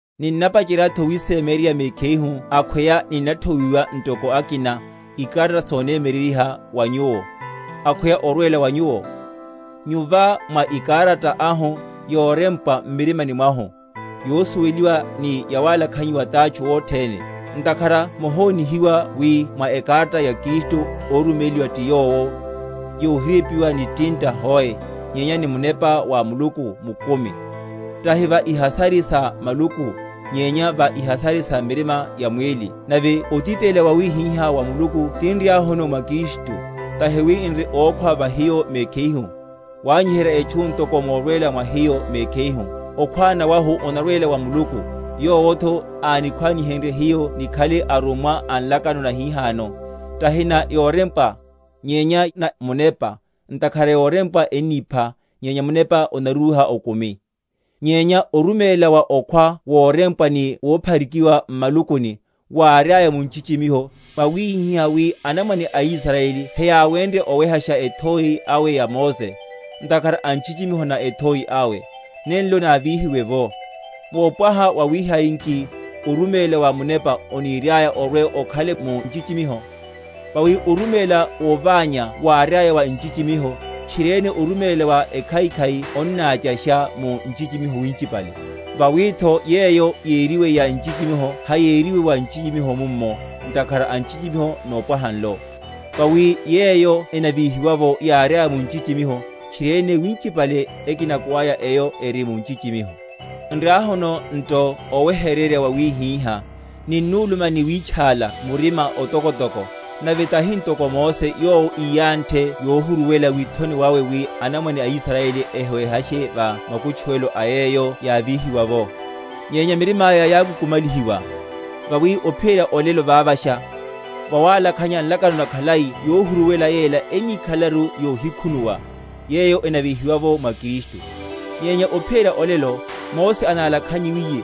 Ninnapacheryatho wísémyeryerya mekhihu akhweya ninnathowiwa, ntoko akina, ikarata sonemyeryeryiha wa nyuwo, akhweya orwela wa nyuwo? Nyu va mwa ekarata ahu, yorempwa m’mirima mwahu, yosuweliwa ni yawalakhanyiwa tátchu othene; ntakhara mohonihiwa wi mwa ekarata ya Kristu, óruméliwa ti hiyo, yohirempwa ni tinta hoe, nyenya ni Munepa wa Muluku mukumi; tahi va ihasari sa maluku, nyenya va ihasari sa mirima ya mwíli. Nave otitelela wawihiha wa Muluku tinriahuno mwa Kristu; tahi wi n’ri ókhwána va hiyo mekhihu, wanyiherya etchu ntoko morwela mwa hiyo mekhihu; okhwána wahu onarwela wa Muluku; yowotho ánikhwanihenrye hiyo nikhale arummwa a nlakano nahihano; tahi na yorempwa, nyenya na munepa; ntakhara yorempwa ennipha, nyenya munepa onarúha okumi. Nyenya oruméla wa okhwa worempwa ni wophari?-?kiwa m’malukuni, wáriaya mu nchichimiho, wawihihá wi anamwane aIsrayeli heyáwenrye owehasha ethoi awe ya Mose, ntakhara a nchichimiho na ethoi awe, nenlo návíhiwe’vo: wopwaha wawihai nki oruméla wa munepa oniriaya orwe‐okhale mu nchichimiho? Vawi oruméla woványa wáriaya wa nchichimiho, tchiriene oruméla wa ekhaikhai onnáchasha mu nchichimiho winchipale. Vawitho yeyo yériwe ya nchichimiho hayériwe ya nchichimiho mummo, ntakhara a nchichimiho nopwaha nlo. Vawi yeyo enavíhiwa’vo yáriaya mu nchichimiho, tchiriene winchipale ekinako aya eyo eri mu nchichimiho. Nriahuno nto oweheryerya wawihiha, ninnuluma ni wítchála murima otokotoko, nave tahi ntoko Mose, yowo íyanthe yohuruwela withoni wawe, wi anamwane a Israyeli ehiwehashe va makutchuwelo a yeyo yávíhiwa’vo; nyenya mirimaya yákukumalihiwa; vawi ophiyerya olelo vavasha, vawalakhanya nlakano nakhalai yohuruwela yela enníkhalelaru yohikhunuwa, yeyo enavíhiwa’vo mwa Kristu. Nyenya ophiyerya olelo, Mose analakhanyiwiye,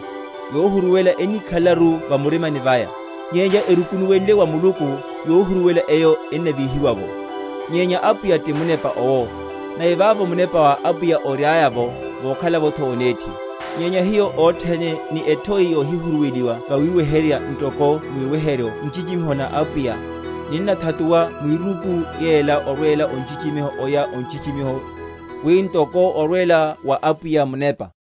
yohuruwela enníkhalelaru va murimani vaya. Nyenya erukunuwenle wa Muluku, yohuruwela eyo ennavíhiwa’vo. Nyenya Apwiya ti Munepa owo; nave vavo Munepa wa Apwiya oriaya’vo vokhalavotho onethi. Nyenya hiyo othene ni ethoi yohihuruweliwa vawiweheryerya ntoko mwiweheryo nchichimiho na Apwiya, ninnathatuwa mwiruku yela orwela o nchichimiho oya o nchichimiho, wi ntoko orwela wa Apwiya Munepa.